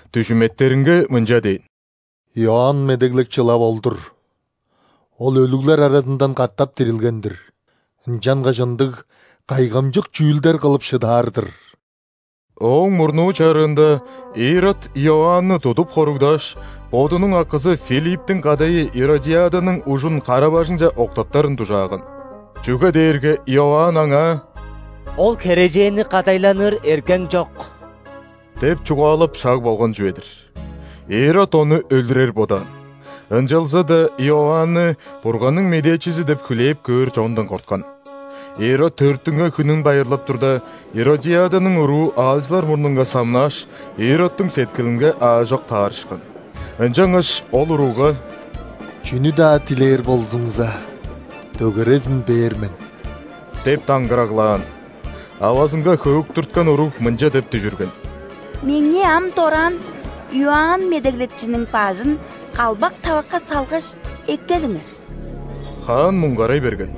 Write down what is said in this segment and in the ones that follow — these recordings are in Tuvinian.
дүжүметтеринге мынча дээн: «Иоанн Медеглекчи ылап ол-дур. Ол өлүглер аразындан катап дирилген-дир! Ынчангаш ындыг кайгамчык чүүлдер кылып шыдаар-дыр!» Ооң мурнуу чарыында Ирод Иоанны тудуп хоругдааш, бодунуң акызы Филипптиң кадайы Иродиаданың ужун кара-бажыңче октаптарын дужааган. Чүге дээрге Иоанн аңаа: «Ол херээженни кадайланыр эргең чок» – деп чугаалап шаг болган чүве-дир. Ирод ону өлүрер бодаан, ынчалза-даа Иоанны Бурганның медээчизи деп хүлээп көөр чондан корткан. Ирод төрүттүнген хүнүн байырлап турда, Иродиаданың уруу аалчылар мурнунга самнааш, Иродтуң сеткилинге аажок таарышкан. Ынчангаш ол уругга: «Чүнү-даа дилээр болзуңза, дөгерезин бээр мен» – деп даңгыраглаан. Авазынга хөөктүрткен уруг мынча деп дүжүрген: «Меңээ ам дораан Иоанн Медеглекчиниң бажын калбак тавакка салгаш, эккелиңер». Хаан муңгарай берген.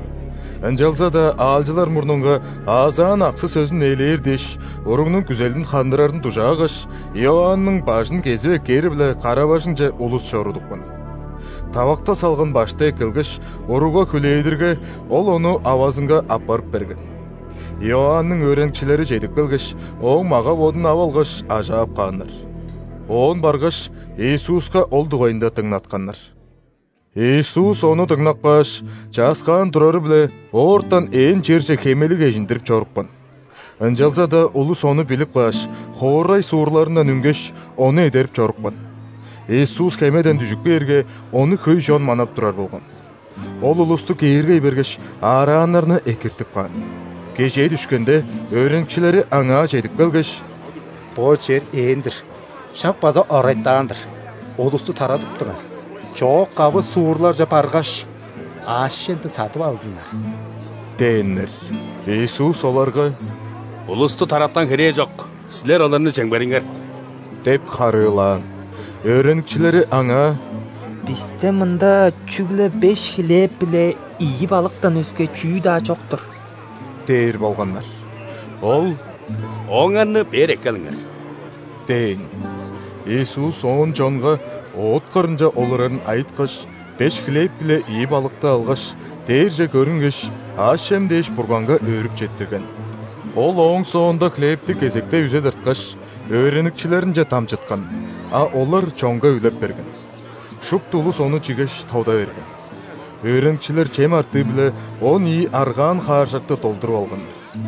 Ынчалза-даа аалчылар мурнунга аазаан аксы-сөзүн ээлээр дээш, уругнуң күзелин хандырарын дужаагаш, Иоанның бажын кезип эккээри-биле кара-бажыңче улус чорудупкан. Тавакта салган башты эккелгеш, уругга хүлээдирге, ол ону авазынга аппарып берген. Иоанның өөреникчилери чедип келгеш, ооң мага-бодун ап алгаш, ажаап кааннар. Оон баргаш, Иисуска ол дугайында дыңнатканнар. Иисус ону дыңнап кааш, чааскаан турары-биле, оортан ээн черже хемелиг эжиндирип чорупкан. Ынчалза-даа улус ону билип кааш, хоорай-суурларындан үнгеш, Ону эдерип чорупкан. Иисус хемеден дүжүп кээрге, Ону хөй чон манап турар болган. Ол улусту кээргей бергеш, аарааннарны экиртип каан. Кежээ дүшкенде, өөреникчилери Аңаа чедип келгеш: «Бо чер ээн-дир, шак база орайтаан-дыр. Улусту тарадыптыңар, чоок-кавы суурларже баргаш, аъш-чемден садып алзыннар» – дээннер. Иисус оларга: «Улусту тараткан херээ чок. Силер оларны чемгериңер» – деп харыылаан. Өөреникчилери Аңаа: «Бисте мында чүгле беш хлеб биле ийи балыктан өске чүү-даа чок-тур» – дээр болганнар. Ол: «Ооңарны бээр эккелиңер» – дээн. Иисус оон чонга оът кырынче олурарын айыткаш, беш хлеб биле ийи балыкты алгаш, дээрже көрүнгеш, аъш-чем дээш, Бурганга өөрүп четтирген. Ол ооң соонда хлебти кезектей үзе тырткаш, өөреникчилеринче дамчыткан, а олар чонга үлеп берген. Шупту улус ону чигеш, тода берген. Өөреникчилер чем артыы-биле он ийи аргаан хааржакты долдуруп алганнар.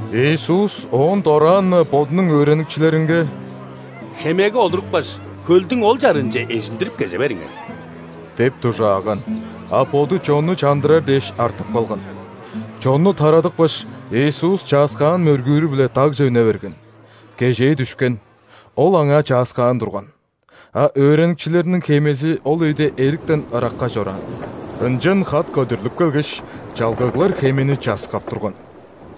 Иисус оон дораан-на Бодунуң өөреникчилеринге: «Хемеге олурупкаш, хөлдүң ол чарыынче эжиндирип кеже бериңер» – деп дужааган. А Боду чонну чандырар дээш артып калган. Чонну тарадыпкаш, Иисус чааскаан мөргүүрү-биле дагже үне берген. Кежээ дүшкен, Ол аңаа чааскаан турган. А өөреникчилериниң хемези ол өйде эриктен ыракка чораан. Ынчан хат көдүрлүп келгеш, чалгыглар хемени часкап турган.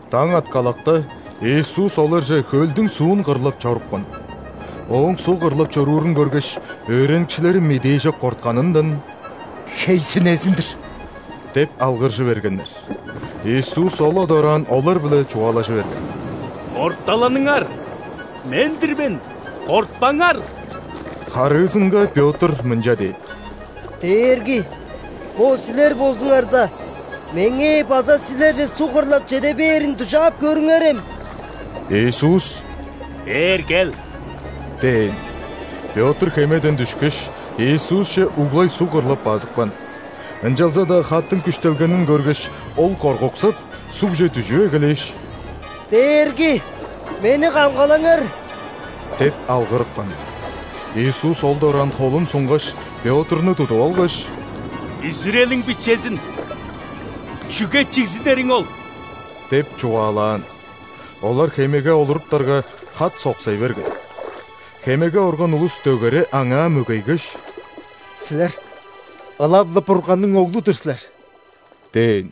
Даң аткалакта, Иисус оларже хөлдүң суун кырлап чорупкан. Ооң суг кырлап чоруурун көргеш, өөреникчилери медээжок кортканындан: «Хей-сүнезин-дир!» – деп алгыржы бергеннер. Иисус ол-ла дораан олар-биле чугаалажы берген: «Орталаныңар, Мен-дир мен, кортпаңар!» Харыызынга Пётр мынча дээн: «Дээрги, бо Силер болзуңарза, меңээ база Силерже суг кырлап чеде бээрин дужаап көрүңерем». Иисус: «Бээр кел!» – дээн. Пётр хемеден дүшкеш, Иисусче углай суг кырлап базыпкан. Ынчалза-даа хаттың күштелгенин көргеш, ол коргуксап, сугже дүжүп эгелээш: «Дээрги, мени камгалаңар!» – деп алгырыпкан. Иисус ол дораан холун сунгаш, Пётрну тудуп алгаш: «Бүзүрелиң бичезин. Чүге чигзинериң ол?» – деп чугаалаан. Олар хемеге олуруптарга, хат соксай берген. Хемеге орган улус дөгере Аңаа мөгейгеш: «Силер ылап-ла Бурганның Оглу-дур силер!» – дээн.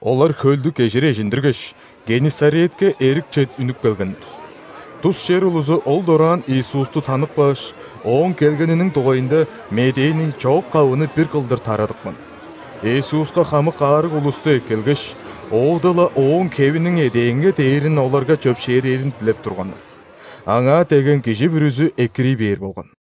Олар хөлдү кежир эжиндиргеш, Геннисаретке эрикче үнүп келгеннер. Тус чер улузу ол дораан Иисусту танып кааш, Ооң келгениниң дугайында медээни чоок-кавыны бир кылдыр тарадыпкан. Иисуска хамык аарыг улусту эккелгеш, оода-ла Ооң хевиниң эдээнге дээрин оларга чөпшээрээрин дилеп турганнар. Аңаа дегген кижи бүрүзү экирий бээр болган.